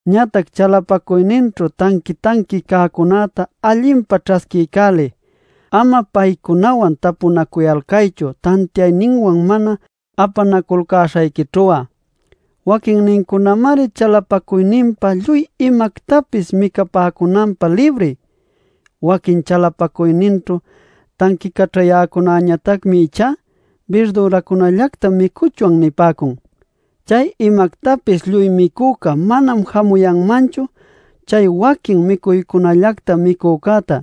Ñatac chalapacuyninćhu tanqui-tanqui cäcunäta allinpa ćhasquiycäliy; ama paycunawan tapunacuyalcaychu tantiayninwan mana apanaculcäśhayquićhu'a. Waquinnincunamari chalapacuyninpa lluy imactapis micapäcunanpä libri. Waquin chalapacuyninćhu tanquicaćhayäcunañatacmi ichá “Birdüracunallactam micuchwan” nipäcun. Chay imactapis lluy micüca manam jamuyanmanchu chay waquin micuycunallacta micücäta.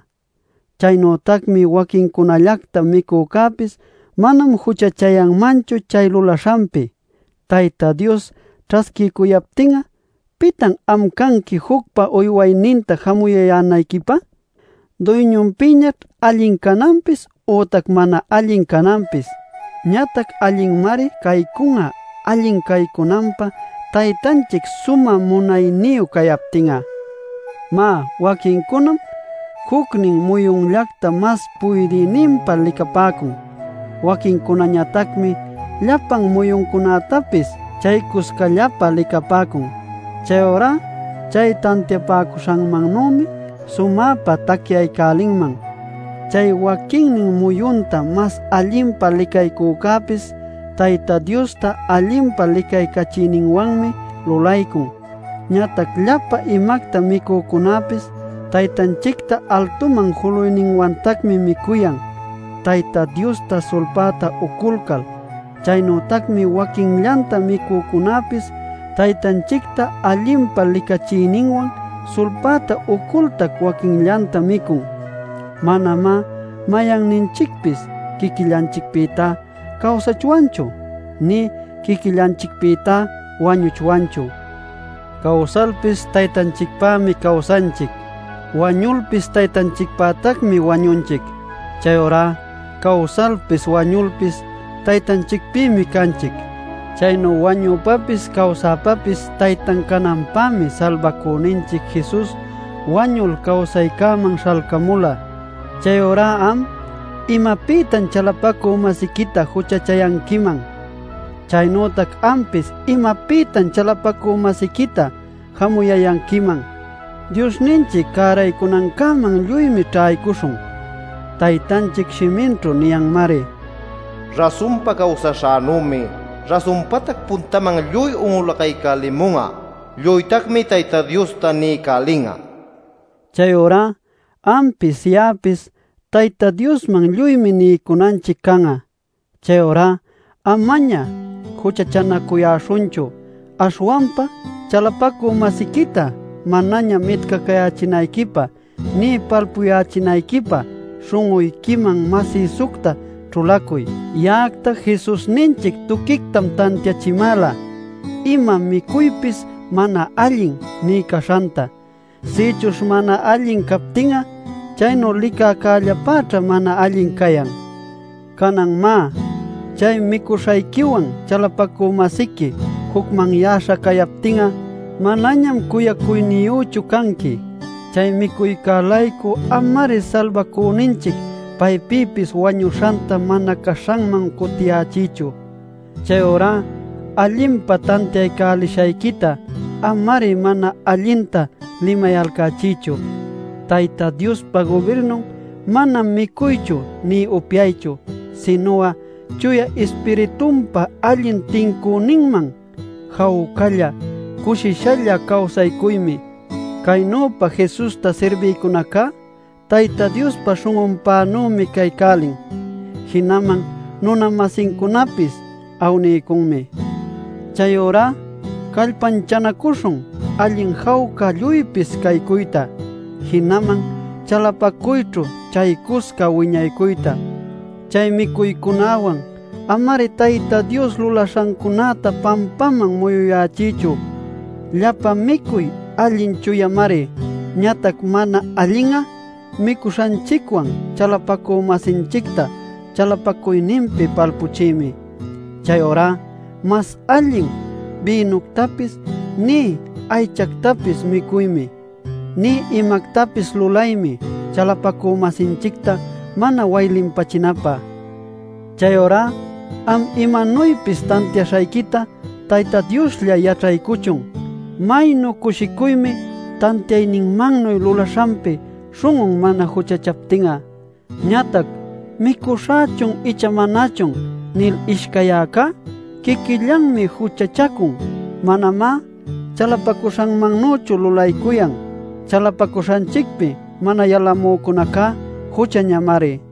Chaynütacmi waquincunallacta micücäpis manam juchachayanmanchu chay lulaśhanpi, Tayta Dios ćhasquiycuyaptin'a. ¿Pitan am canqui jucpa uywayninta jamuyayänayquipä? Duyñunpïñaćh allin cananpis ütac mana allin cananpis. Ñatac allinmari caycun'a, allin caycunanpä Taytanchic sumä munayniyu cayaptin'a. Má, waquincunam jucnin muyunllacta mas puydïninpä licapäcun. Waquincunañatacmi llapan muyuncunätapis chaycuscallapä licapäcun. Chayurá chay tantiapäcuśhanmannümi sumäpa tacyaycälinman. Chay waquinnin muyunta mas allinpa licaycücäpis Tayta Diosta allinpa licaycachiyninwanmi lulaycun. Ñatac llapa imacta micücunäpis Taytanchicta altuman juluyninwantacmi micuyan Tayta Diosta sulpäta uculcal. Chaynütacmi waquinllanta micücunäpis Taytanchicta allinpa licachiyninwan sulpäta ucultac waquinllanta micun. Manamá mayanninchicpis quiquillanchicpïta cawsachwanchu; nï quiquillanchicpïta wañuchwanchu. Cawsalpis Taytanchicpämi cawsanchic. Wañulpis Taytanchicpätacmi wañunchic. Chayurá cawsalpis wañulpis Taytanchicpïmi canchic. Chaynu wañüpapis cawsäpapis Taytan cananpämi Salbacüninchic Jesus wañul cawsaycäman śhalcamula. Chayurá am ¿imapïtan chalapacü-masiquita juchachayanquiman? Chaynütac ampis ¿imapïtan chalapacü-masiquita jamuyayanquiman? ¡Diosninchic cäraycunancäman lluymi ćhaycuśhun! Taytanchic shiminćhu niyanmari: “Rasunpa cawsaśhänümi rasunpatac puntäman lluy un'ulaycälimun'a; lluytacmi Tayta Diosta niycälin'a” nil. Chayurá ampis ya'apis Tayta Diosman lluymi niycunanchic can'a. Chayurá amaña juchachänacuyäśhunchu. Aśhwanpa chalapacü-masiquita manaña mitcacayächinayquipä nï palpuyächinayquipä śhun'uyquiman masïsucta ćhulacuy. Ya'acta Jesusninchic tuquictam tantiachimäla ima micuypis mana allin nï caśhanta. Sïchuśh mana allin captin'a chaynu licäcällapäćha mana allin cayan. Canan má, chay micuśhayquiwan chalapacü-masiqui jucmanyäśha cayaptin'a, manañam cuyacuyniyüchu canqui. Chay micuycä-laycu ama-ari Salbacüninchic paypïpis wañuśhanta mana caśhanman cutiyächiychu. Chayurá allinpa tantiaycälishayquita ama-ari mana allinta limayalcächiychu. Tayta Diospa gubirnun manam micuychu nï upyaychu, sinu'a Chuya Ispiritunpa allin tincüninman, jawcalla, cushishalla cawsaycuymi. Caynüpa Jesusta sirbïcunacá Tayta Diospa śhun'unpänümi caycälin; jinaman nuna-masincunapis awniycunmi. Chayurá callpanchanacuśhun allin jawca lluypis caycuyta, jinaman chalapacuyćhu chaycusca wiñaycuyta. Chay micuycunäwan ama-ari Tayta Dios lulaśhancunäta pampaman muyuyächiychu. Llapa micuy allin chuyamari. Ñatac mana allin'a micuśhanchicwan chalapacü-masinchicta chalapacuyninpi palpachiymi. Chayurá mas allin bïnuctapis nï aychactapis micuymi, nï imactapis lulaymi chalapacü-masinchicta mana waylinpächinapä. Chayurá am imanuypis tantiaśhayquita Tayta Dioslla yaćhaycuchun. Maynu cushicuymi tantiayninmannuy lulaśhanpi śhun'un mana juchachaptin'a. Ñatac “Micuśhächun icha manachun” nil ishcayyäcá quiquillanmi juchachacun. Manamá chalapacuśhanmannüchu lulaycuyan. Chalapacuśhanchicpi mana yalamücunacá juchañamari.